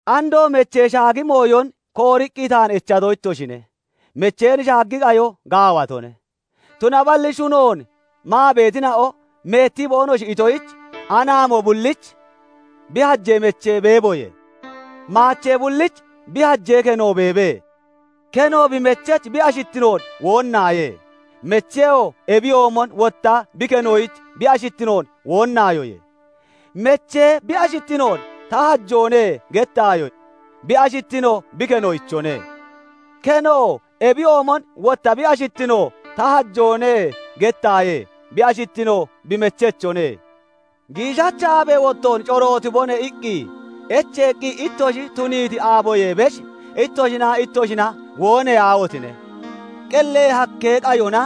Andoo mechee shaagi mooyon kooriqqi taan echato ittoshine. Mecheen shaagi qayo gaawatone. Tunaballi shunoon maa beetina'o meettii boonoshi itoyich, anaamo bullich bi hajee mechee beeboye; maachee bullich bi hajee keno beebe. Keno bi mechech bi ashittinoon woonnaaye; mecheyoo ebiyoomon wotta bi kenoyich bi ashittinoon woonnaayoye. Meche bi ashittinoon "Ta hajoone" gettaayo; bi ashittino bi kenoochone. Kenoo ebiyoomon wotta bi ashittinoon "Ta hajoone" gettaaye; bi ashittino bi mechechone. "Giishacha aabee wottoon corootibone" iqqi echeeqqi ittoshi tuniiti aaboyee besh, ittoshinaa ittoshina wooneyaahotine! Qellee hakkee qayona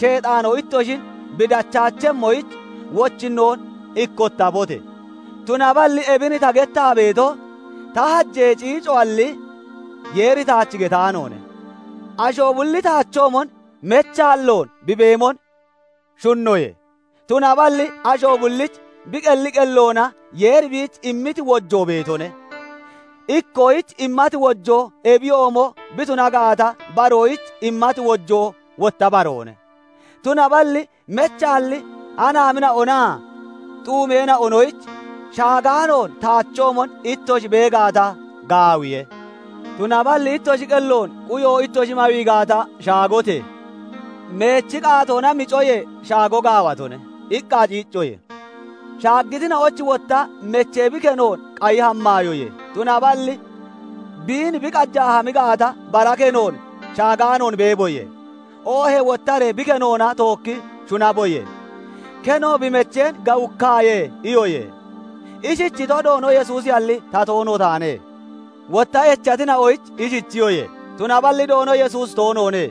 Sheexaanoo ittoshin bi dachaachemmoyich, wochinnoon ikkottabote! Tunaballi ebin ta gettaa beeto, ta hajee ciicoalli, Yeeri taach getaanoone. Asho bulli taachoomon mechaalloon bi beemon shunnoye; tunaballi asho bullich bi qelli qelloona Yeeri biich immiti wojoo beetone; ikkoyich immati wojoo ebiyoomo bi tuna gaata, baroyich immati wojoo wotta baroone. Tunaballi mechaalli anaamina'onaa xuumeena'onoyich "Shaagaanoon taachoomon ittoshi bee gaata, gaawiye; tunaballi ittoshi qelloon quyo ittoshi mawii gaata, shaagote! Meechi qaatoona micoyee, shaago gaawatone" iqqa ciiccoye. Shaaggitina'oyich wotta "Meche bi kenoon qayi hammaayoye; tunaballi biin bi qajaa hami gaata, bara kenoon shaagaanoon beeboye; oohee wottaree bi kenoona tookki shunaboye. Keno bi mecheen gawukkaaye" iyoye. Ishichito, Doono Yesuusiyalli, ta toono taane. Wotta echatina'oyich ishichiyoye; tunaballi Doono Yesuusi toonoone;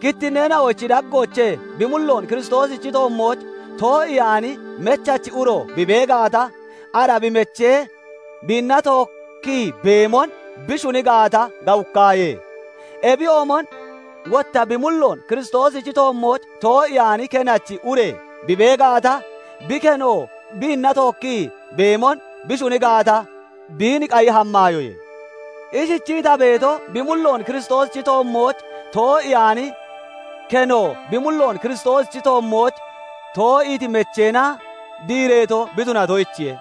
kittinneena'ochi daggoochee bi mulloon Kiristoosichi toommooch too'iyaani mechachi uro bi bee gaata, ara bi mechee biinna tookkii beemon bi shuni gaata, gawukkaaye. Ebiyoomon wotta bi mulloon Kiristoosichi toommooch too'iyaani kenachi ure bi bee gaata, bi keno biinna tookkii beemon bi shuni gaata, biin qayi hammaayoye. Ishichii ta beeto, bi mulloon Kiristoosichi toommooch too'iyaani keno bi mulloon Kiristoosichi toommooch too'iiti mecheena diireeto bi tunatoyichiye;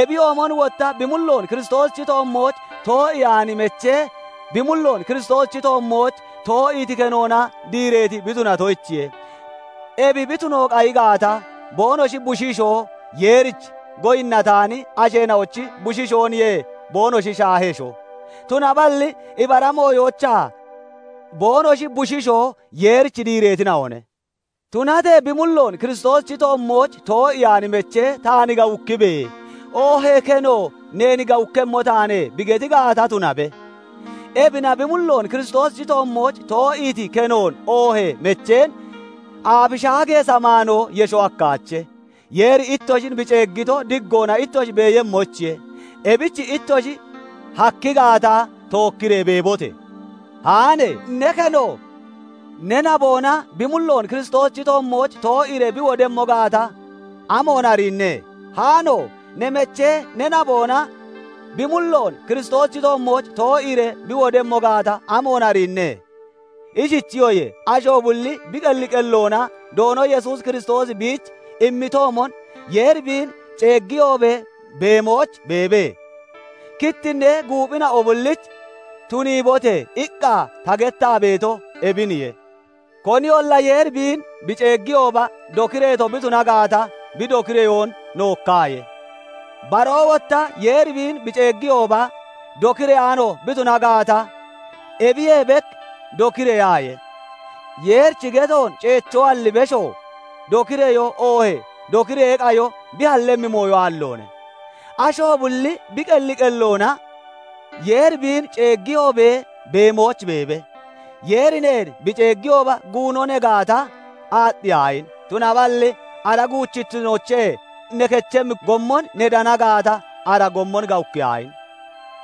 ebiyoomon wotta bi mulloon Kiristoosichi toommooch too'iyaani mechee bi mulloon Kiristoosichi toommooch too'iiti kenoona diireeti bi tunatoyichiye. Ebi bi tuno qayi gaata, boonoshi bushiishoo Yeerich goyinnataani asheena'ochi bushiishooniye boonoshi shaahesho; tunaballi ibara mooyoochaa boonoshi bushiishoo Yeerich diireetina'one. Tunatee bi mulloon Kiristoosichi toommooch too'iyaani mechee "Taan gawukkibe!" oohee keno "Neen gawukkemmo taane" bi geti gaata, tunabe. Ebina bi mulloon Kiristoosichi toommooch too'iiti kenoon oohee mecheen aafi shaagee samaanoo yesho hakkaache. Yeeri ittoshin bi ceeggito, diggoona ittoshi beeyemmoyichiye; ebich ittoshi hakki gaata, tookkiree beebote! Haane! Ne keno ne naboona bi mulloon Kiristoosichi toommooch too'iiree bi wodemmo gaata, amoon ariinne? Haano! Ne mechee ne naboona bi mulloon Kiristoosichi toommooch too'iiree bi wodemmo gaata, amoon ariinne? Ishichiyoye; asho bulli bi qelli qelloona Doono Yesuus Kiristoosi biich immitoomon, Yeeri biin ceeggiyoobee beemooch beebe. Kittinnee guuphina'o bullich "Tuniibote!" iqqa ta gettaa beeto ebiniye. Koniyolla Yeeri biin bi ceeggiyooba dokireeto bi tuna gaata, bi dokireyoon nookkaaye; baroo wotta Yeeri biin bi ceeggiyooba dokireyaano bi tuna gaata, ebiyee bek dokireyaaye. Yeerichi getoon ceechoalli besho, dokireyoo oohee dokireyee qayo bi hallemmi mooyo aalloone. Asho bulli bi qelli qelloona Yeeri biin ceeggiyoobee beemooch beebe. Yeeri neen bi ceeggiyooba guuno ne gaata, aaxxiyaahine! Tunaballi ara guuchittinoochee ne kechemmi gommon ne dana gaata, ara gommon gawukkiyaahine!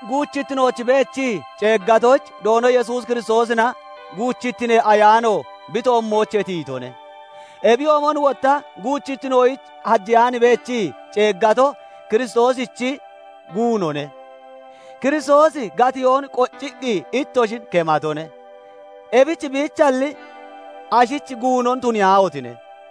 Guuchittinooch beechii ceeggatoyich Doono Yesuus Kiristoosina guuchittinee ayaano bi toommoochee tiyitone; ebiyoomon wotta guuchittinoyich hajeyaan beechii ceeggato Kiristooshichi guunone. Kiristoosi gatiyoon qocciqqi ittoshin kematone; ebich biichalli, ashich guunon tuniyaahotine!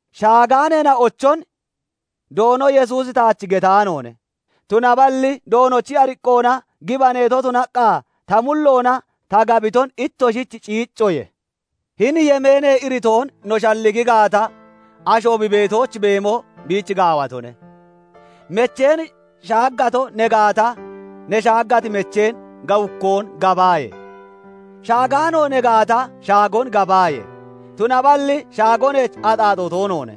Shaagaaneena'ochon Doono Yesuusi taach getaanoone; tunaballi Doonochi ariqqoona gibaneeto tunaqqa ta mulloona ta gabiton ittoshich ciiccoye. Hini yemeenee iritoon no shalligi gaata, asho bi beetooch beemo biich gaawatone. Mecheen shaaggato ne gaata, ne shaaggati mecheen gawukkoon gabaaye! Shaagaano ne gaata, shaagon gabaaye! Tunaballi shaago neech axaaxoo toonoone;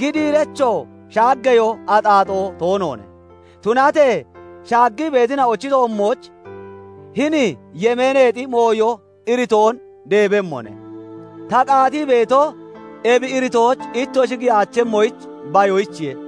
gidiirechoo shaaggeyoo axaaxoo toonoone; tunatee shaaggii beetina'ochi toommooch hini yemeeneexi mooyo iritoon deebemmone; ta qaatii beetoo ebi iritooch ittoshi giyaachemmoyich bayoyichiye.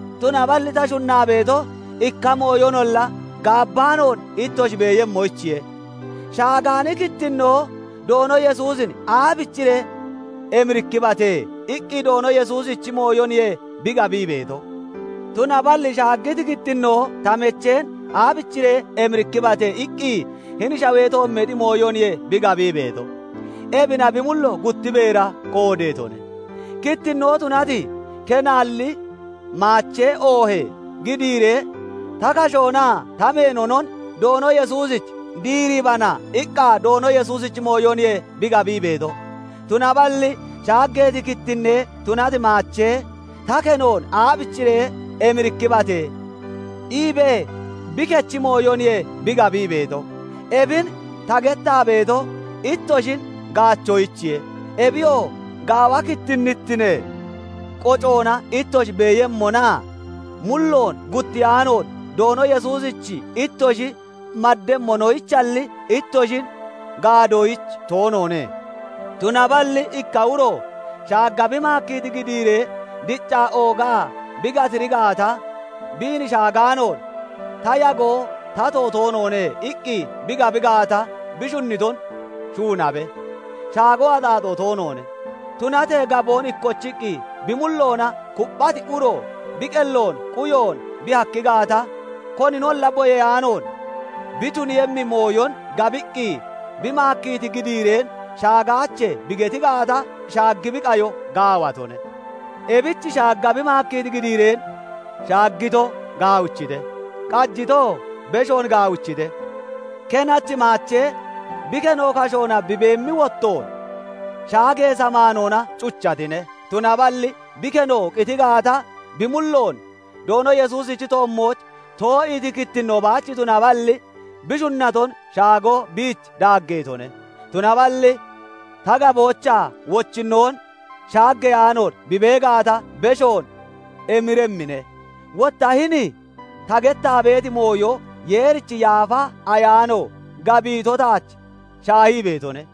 Tunaballi ta shunnaa beeto, ikka mooyonolla gaabbaanoon ittoshi beeyemmoyichiye. Shaagaani kittinnoo "Doono Yesuusin aabichiree emirikkibate?" iqqi Doono Yesuusichi mooyoniye bi gabii beeto. Tunaballi shaaggiti kittinnoo "Ta mecheen aabichiree emirikkibate?" iqqi hini shawee toommeexi mooyoniye bi gabii beeto; ebina bi mullo gutti beera qoodeetone. Kittinnoo tunati, kenaalli maachee oohee gidiiree "Ta kashoonaa ta meenonon Doono Yesuusich diiribana" iqqa Doono Yesuusichi mooyoniye bi gabii beeto. Tunaballi shaaggeeti kittinne tunati maachee "Ta kenoon aabichiree emirikkibate?" iibee bi kechi mooyoniye bi gabii beeto. Ebin ta gettaa beeto, ittoshin gaachoyichiye; ebiyoo gaawa kittinnittinee qocoona ittoshi beeyemmonaa mulloon guttiyaanoon Doono Yesuusich ittoshi maddemmonoyichalli, ittoshin gaadoyich toonoone. Tunaballi ikka uro shaagga bi maakkiiti gidiiree diccaa oogaa bi gatiri gaata, "Biin shagaanoon ta yagoo tato toonoone" iqqi bi gabi gaata, bi shunniton shuunabe; shaago axaaxoo toonoone. Tunatee gaboon ikkochiqqi bi mulloona kupphati uro, bi qelloon quyoon bi hakki gaata, koninolla boyeyaanoon bi tuniiyemmi mooyon gabiqqi, bi maakkiiti gidiireen "Shagaache" bi geti gaata, shaagi bi qayo gaawatone. Ebich shaagga bi maakkiiti gidiireen shaaggito gaawichite; qajitoo beshoon gaawichite. Kenachi maachee bi keno kashoona bi beemmi wottoon, shaagee samaanoona cuchatine; tunaballi bi keno qiti gaata, bi mulloon Doono Yesuusichi toommooch too'iiti kittinnoon baach tunaballi, bi shunnaton shaago biich daaggeetone. Tunaballi ta gaboochaa wochinnoon shaaggeyaanoon bi bee gaata, beshoon emiremmine. Wotta hini ta gettaa beeti mooyo Yeerichi Yaafa Ayaano gabiito taach shaahii beetone.